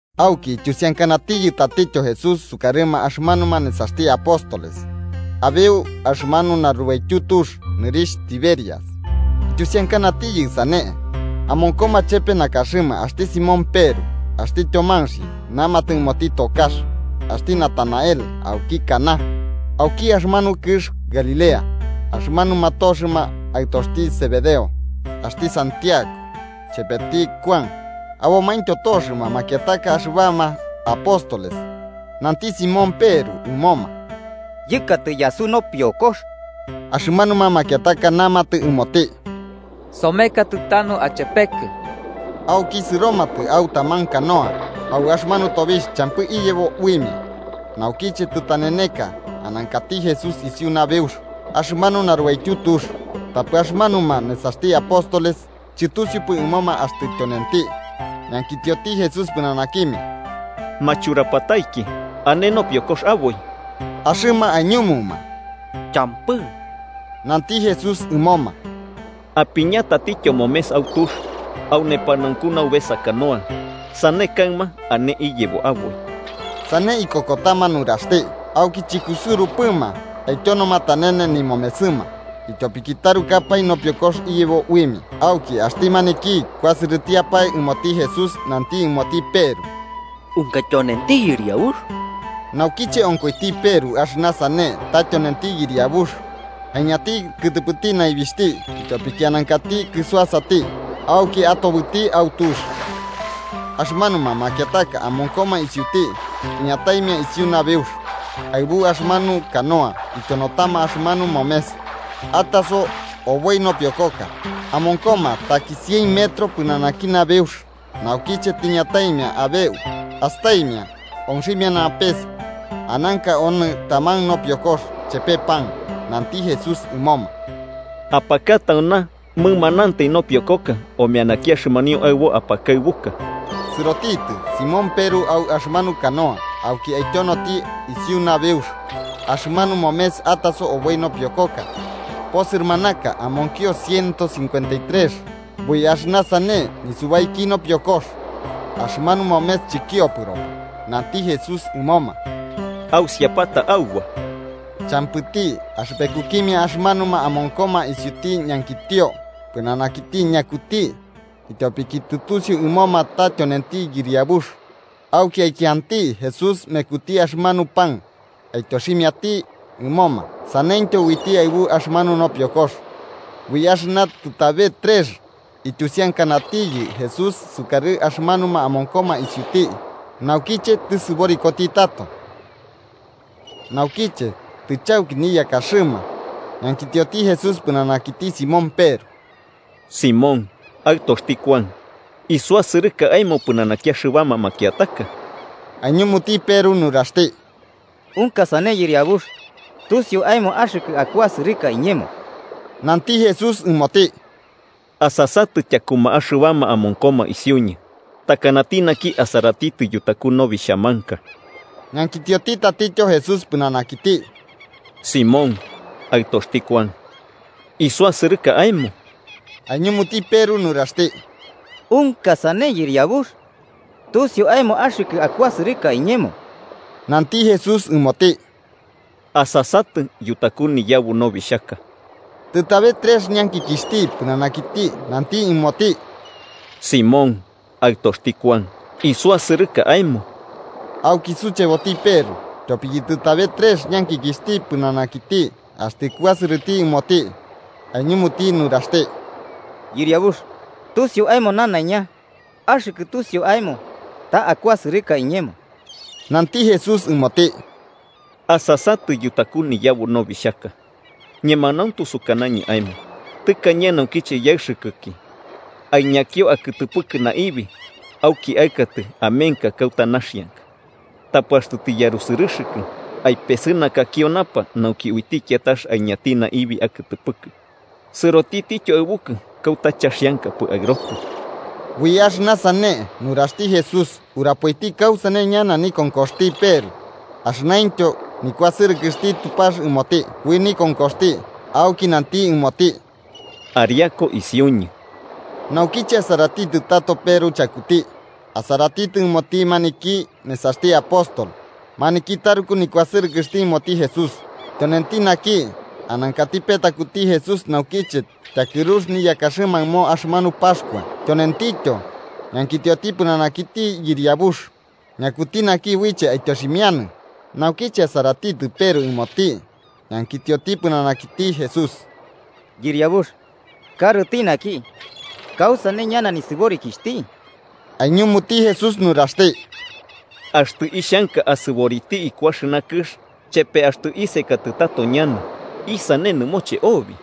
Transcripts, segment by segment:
Auki ityusiankanatiyɨ tatityo Jesús sukarɨma axɨmanuma nesaxti apóstoles, abeu axɨmanu narubaityu tux nɨrixh Tiberias. Ityusiankanatiyɨ sane: Amonkoma chepe nakaxɨma axti Simón Peru, axti Tyomanxi namatɨ ɨmoti tokax, axti Natanael auki Caná auki axɨmanu kɨx Galilea, axɨmanuma toxɨma aɨtoxti Zebedeo axti Santiago chepeti Kuan abomaintyo toxɨma makiataka axɨbama apóstoles. Nanti Simón Peru ɨmoma: –Yɨkatɨ yasu nopiokox. Axɨmanuma makiataka namatɨ ɨmoti: –Somekatɨ tanu achepekɨ. Auki sɨromatɨ au taman canoa. Au axɨmanu tobixh champɨ iyebo uimia. Naukiche tɨtaneneka, anankati Jesús isiu nabeux axɨmanu narubaityu tux, tapɨ axɨmanuma nesaxti apóstoles chɨtusiupɨ ɨmoma axtɨ tyonenti. Ñankitioti Jesús pɨnanakimia: –Ma churapataiki, ¿ane nopiokox aboi? Axɨma aiñumuma: –Champɨ. Nanti Jesús ɨmoma: –Apiña tatityo momes au tux au nepanaunku naubesa canoa. Sane kaɨma ane iyebo aboi. Sane ikokotama nuraxti, auki chɨkusɨurupɨma aityonoma tanene nimomesɨma ityopiki tarukapae nopiokox iyebo uimia. Auki axti maniki kuasɨrɨtiapae ɨmoti Jesús nanti ɨmoti Peru: –¡Unka tyonenti Yɨriabux! Naukiche onkoiti Peru axɨna sane ta tyonenti Yɨriabux, aiñanti kɨtɨpɨti naibixhti ityopiki anankati kɨsuasati, auki atobɨti au tux. Axɨmanuma makiataka amonkoma isiuti iñataimia isiu nabeux aɨbu axɨmanu canoa ityonotama axɨmanu momes ataso oboi nopiokoka, amonkoma taki cien metros pɨnanaki nabeux. Naukiche tiñataimia abeu, astaimia onximiana pes, ananka onɨ taman nopiokox chepe pan. Nanti Jesús ɨmoma: –Apaka tauna mɨmanantai nopiokoka omeanaki axɨmanio aɨbo apakaɨbuka. Sɨrotitɨ Simón Peru au axɨmanu canoa auki aityonoti isiu nabeux axɨmanu momes ataso oboi nopiokoka posɨrɨmanaka, amonkio ciento cincuenta trex. Ui axɨna sane nisubaiki nopiokox, axɨmanu momes chɨkiopɨropɨ. Nanti Jesús ɨmoma: –Ausiapata auba. Champɨti axɨpekukimia axɨmanuma amonkoma isiuti ñankitio pɨnanakiti ñakuti, ityopiki tusiu ɨmoma ta tyonenti Yɨriabux. Auki aikianti Jesús mekuti axɨmanu pan, ityoximiati ɨmoma. Saneityo uiti aɨbu axɨmanu nopiokox. Ui axɨna tɨtabe trex ityusiankanatiyɨ Jesús sukarɨ axɨmanuma amonkoma isiuti naukiche tɨsɨborikoti tato. Naukiche tɨchauki niyakaxɨma, ñankitioti Jesús pɨnanakiti Simón Peru: –Simón, aɨtoxti Kuan, ¿isuasɨrɨka aemo pɨnanaki axɨbama makiataka? Aiñumuti Peru nuraxti: –Unka sane Yɨriabux, tusiu aemo axɨkɨ akuasɨrɨka iñemo. Nanti Jesús ɨmoti: –Asasatɨ tyakuma axɨbama amonkoma isiuñɨ, takanati naki asaratitɨ yutaku nobixhamanka. Ñankitioti tatityo Jesús pɨnanakiti: –Simón, aɨtoxti Kuan, ¿isuasɨrɨka aemo? Aiñumuti Peru nuraxti: –Unka sane Yɨriabux, tusiu aemo axɨkɨ akuasɨrɨka iñemo. Nanti Jesús ɨmoti: –Asasatɨ yutaku niyabu nobixhaka. Tɨtabe trex ñankikixhti pɨnanakiti nanti ɨmoti: –Simón, aɨtoxti Kuan, ¿isuasɨrɨka aemo? Auki sucheboti Peru tyopiki tɨtabe trex ñankikixhti pɨnanakiti axtɨ kuasɨrɨti ɨmoti. Aiñumuti nuraxti: –Yɨriabux, tusiu aemo nanaiña: axɨkɨ tusiu aemo ta akuasɨrɨka iñemo. Nanti Jesús ɨmoti. –Asasatɨ yutaku niyabu nobixhaka. Ñemanauntu sukanañɨ aemo tɨkañe naukiche yaɨxɨkɨki, aiñakio akɨtɨpɨkɨ naibi auki aɨkatɨ amenka kauta naxianka. Tapɨ axtɨ tiyarusɨrɨxɨkɨ, aipesɨnakakio napa nauki uiti kiatax aiñanti naibi akɨtɨpɨkɨ, sɨrotityo aɨbukɨ kauta chaxiankapɨ aɨrotɨ. Ui axɨna sane nuraxti Jesús, urapoiti kausane ñana nikonkoxti Peru axɨnaintyo nikuasɨrɨkɨxti Tupax ɨmoti ui nikonkoxti. Auki nanti ɨmoti: –¡Ariaku isiuñɨ! Naukiche asaratitɨ tato Peru chakuti, asaratitɨ ɨmoti maniki nesaxti apóstol maniki taruku nikuasɨrɨkɨxti ɨmoti Jesús, tyonenti naki anankati petakuti Jesús naukiche tyakɨrux niyakaxɨma ɨmo axɨmanu Paxkua, tyonentityo ñankitioti pɨnanakiti: “Yɨriabux, ¿ñakuti naki uiche aityoximianɨ?” Naukiche asaratitɨ Peru ɨmoti, ñankitioti pɨnanakiti Jesús: –Yɨriabux, karɨti naki, ¿kausane ñana nisɨborikixhti? Aiñumuti Jesús nuraxti: –Axtɨ ixhanka asɨboriti iku axɨna kɨx chepe axtɨ isekatɨ tato ñana, ¿isane nɨmoche obi?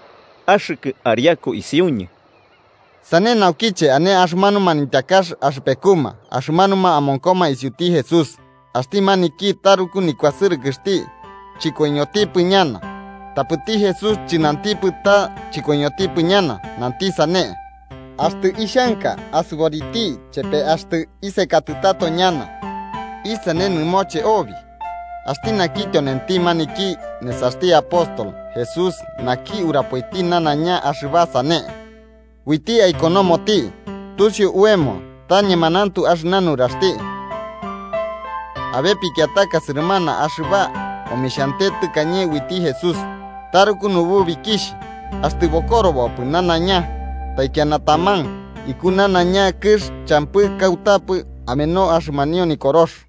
Axɨkɨ ariaku isiuñɨ. Sane naukiche ane axɨmanu manityakax axɨpekuma axɨmanuma amonkoma isiuti Jesús, axti maniki taruku nikuasɨrɨkɨxti chɨkoiñotipɨ ñana. Tapɨti Jesús chɨnanti ta chɨkoiñotipɨ ñana. Nanti sane: “Axtɨ ixhanka asɨboriti chepe axtɨ isekatɨ tato ñana, ¿isane nɨmoche obi?” Axti naki tyonenti maniki nesaxti apóstol Jesús naki urapoiti nanaiña axɨba sane. Uiti aikonomoti, tusiu oemo ta ñemanauntu axɨna nuraxti. Abe pikiataka sɨrɨmana axɨba omixhiante tɨkañe uiti Jesús. Taruku nububikixh, axtɨ bokorobopɨ nanaiña taikiana taman, iku nanaiña kɨx champɨ kautapɨ ameno axɨmanio Nikorox.